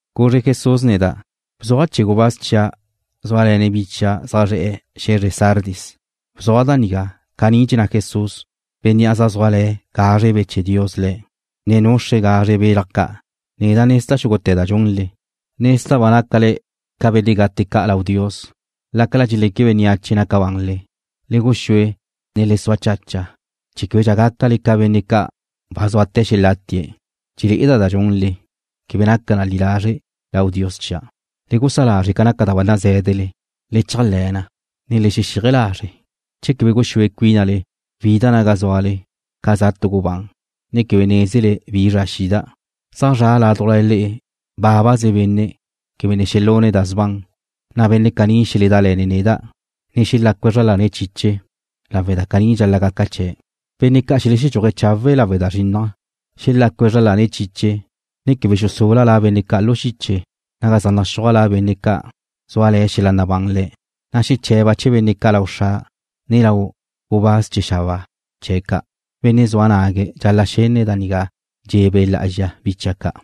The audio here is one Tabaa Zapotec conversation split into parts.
Guzre Jesús neda': ―Bzuaj chee̱ gubáz chia' zúale̱ne̱' bi chia' zaj zre̱'e̱ xe̱zre Sardis. Bzuaj da nigá: Caní dxenná Jesús, Bénnea' zaj zúale̱ gazre Be' chee̱ Dios Le̱', ne nuxre̱' da gazre ca' zaj naca ca belaj ca'. Neda' nezda' xúgute̱ da dxunle. Nezda' ba nácale ca benne' gate ca' lau Dios lácala dxeleque bénneache naca banle. Le guxúe, ne le sua chacha chee̱ québedxa gácale ca benne' ca' ba zúate̱ xelátie̱'. Dxele'eda' da dxunle, quebe naca na li lazre' lau Dios chia'. Le gusá lazre' ca naca da ba nazé̱dele. Le chéajle̱ na, ne le xexíaje lazre'. Che quebe guxúe cuínale wida' naga zúale ca za tu gubán, ne quebe nézele bi zra xida'. Zaj zra' ládujla le'e bábaze benne' quebe ne xelune̱' da sban, na' benne' caní xeledále̱ne̱' neda', ne xelácue̱' zra lane̱' chiche lawe' da caní dxal-la' gaca chee̱'. Benne' ca' xeledxúaje̱' chawe' lawe' da zrinnaj xelácue̱' zra lane̱' chiche ne quebe xusula' la benne' ca' lu xiche naga zaj naxúaj la benne' ca' zúale̱ xel-la' nabán le̱', na' xeche̱ba' chee̱ benne' ca' lau Xra' ne lau gubáz chee̱ xabáa chee̱' ca'. Benne' zua nague̱' dxal-la' xenne̱' da nigá dxe̱ Be' Lá'azxa bi chia' ca'.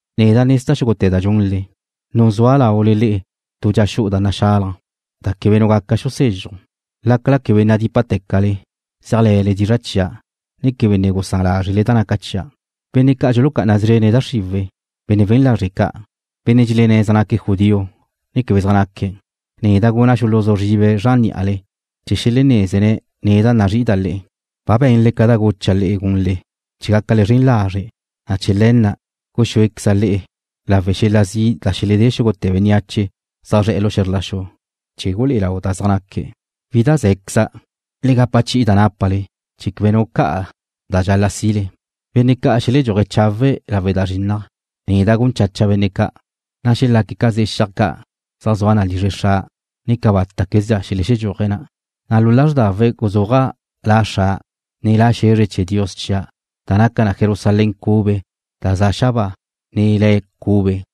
Neda' nezda' xúgute̱ da dxunle. Nuzúa' laule le'e tu dxa xu'u da naxalaj, da quebe nu gaca xusezxuj. Lácala quebe nadípate̱cale, zéajle̱le dizra' chia', ne quebe ne gusán lázrele da naca chia'. Benne' ca' dxulucá'ana szrene̱' da xriwe̱', benne' we̱n lazre' ca', benne' dxelenné̱' zaj naque̱' judío ne quebe zaj naque̱', neda' guna' xuluzú zribe̱' zran ní'ale chee̱ xelenézene̱' neda' nazrí'ida' le'e. Ba be̱nle ca da gucha' le'e gunle chee̱ gácale zren lazre', na' chee̱ le̱ na' guxúequeza' le'e lawe' xel-la' zi' da xeledé xúgute̱ bénneache zaj zre̱'e̱ lu xe̱zr la xu, chee̱ gulé'e lau da zaj naque̱'. Wídaze̱queza'. Le gapa chi'i da nápale chee̱ quebe nu ca'a ca da dxal-la' si'le. Benne' ca' xeledxúaje̱' chawe' lawe' da zrinnaj, neda' gun chacha' benne' ca', na' xelaque̱' ca ze'e xiaj ca' zaj zua na lizre Xra', ne cabátaquezdxa xelexedxúaje̱' na', na' lu lázrdawe̱' guzúaja' La Xra', ne la xe̱zre chee̱ Dios chia' da naca na Jerusalén cube da za' xabáa, ne La' cube.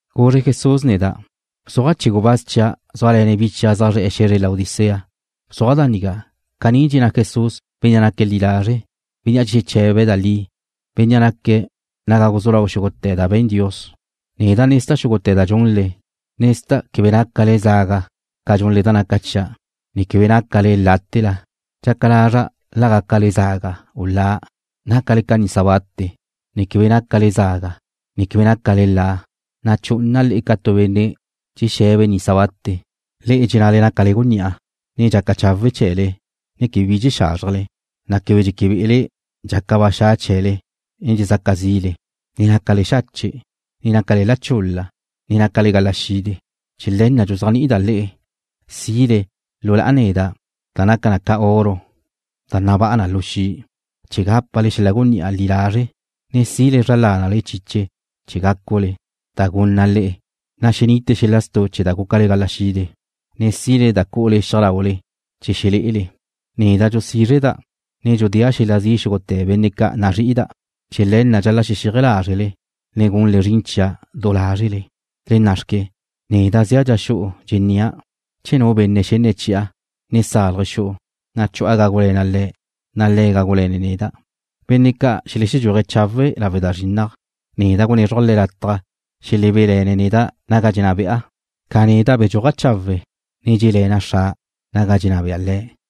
Guzre Jesús neda': ―Bzuaj chee̱ gubáz chia' zúale̱ne̱' bi chia' zaj zre̱'e̱ xe̱zre Laodicea. Bzuaj da nigá: Caní dxenná Jesús, Bénnea' naque̱' li lazre', Bénnea' dxexeche̱be̱' da li, Bénnea' naque̱' naga guzú lau xúgute̱ da be̱n Dios. Neda' nezda' xúgute̱ da dxunle. Nezda' quebe nácale zaga ca dxunle da naca chia', ne quebe nácale láte̱la. Dxaca lazra' la gácale zaga u la. Nácale ca nisa bate, ne quebe nácale zaga, ne quebe nácale la, na' chu'una' le'e ca tu benne' dxexe̱be̱' nisa bate. Le'e dxennale nácale gunní'a, ne dxaca chawe' chee̱le ne quebe bi dxexázrjele, na' quebe dxéquebe'ele' dxaca ba xa' chee̱le ne dxezaca zi'le, ne nácale xache', ne nácale la chul-la, ne nácale gala xide. Chee̱ le̱ na' dxuzéajni'ida' le'e si'le lu na' neda' da naca ca oro da nabá'a na lu xi', chee̱ gápale xel-la' gunní'a li lazre', ne si'le zra lánale chiche chee̱ gácule, da gunna' le'e, na' xenite xel-la' stu' chee̱ da gúcale gala xide, ne si'le da cu'ule xiaj laule chee̱ xelé'ele. Neda' dxusízreda', ne dxudéa' xel-la' zi' xúgute̱ benne' ca' nazrí'ida'. Chee̱ le̱ na' dxal-la' xexíaje lázrele ne gunle zrin chia' du lázrele. Le na' xque. Neda' zea' dxa xu'u dxennia'. Che nu benne' xenne̱' chi'a, ne salje̱' xu'u, na' chu'a gágule̱na' le̱', na' le̱' gágule̱ne̱' neda'. Benne' ca' xeledxúaje̱' chawe' lawe' da zrinnaj, neda' gunézruja' le̱' lataj xelebé'le̱ne̱' neda' naga dxenná be'a, ca neda' bedxúaja' chawe', ne dxé'le̱na' Xra' naga dxenná bea Le̱'.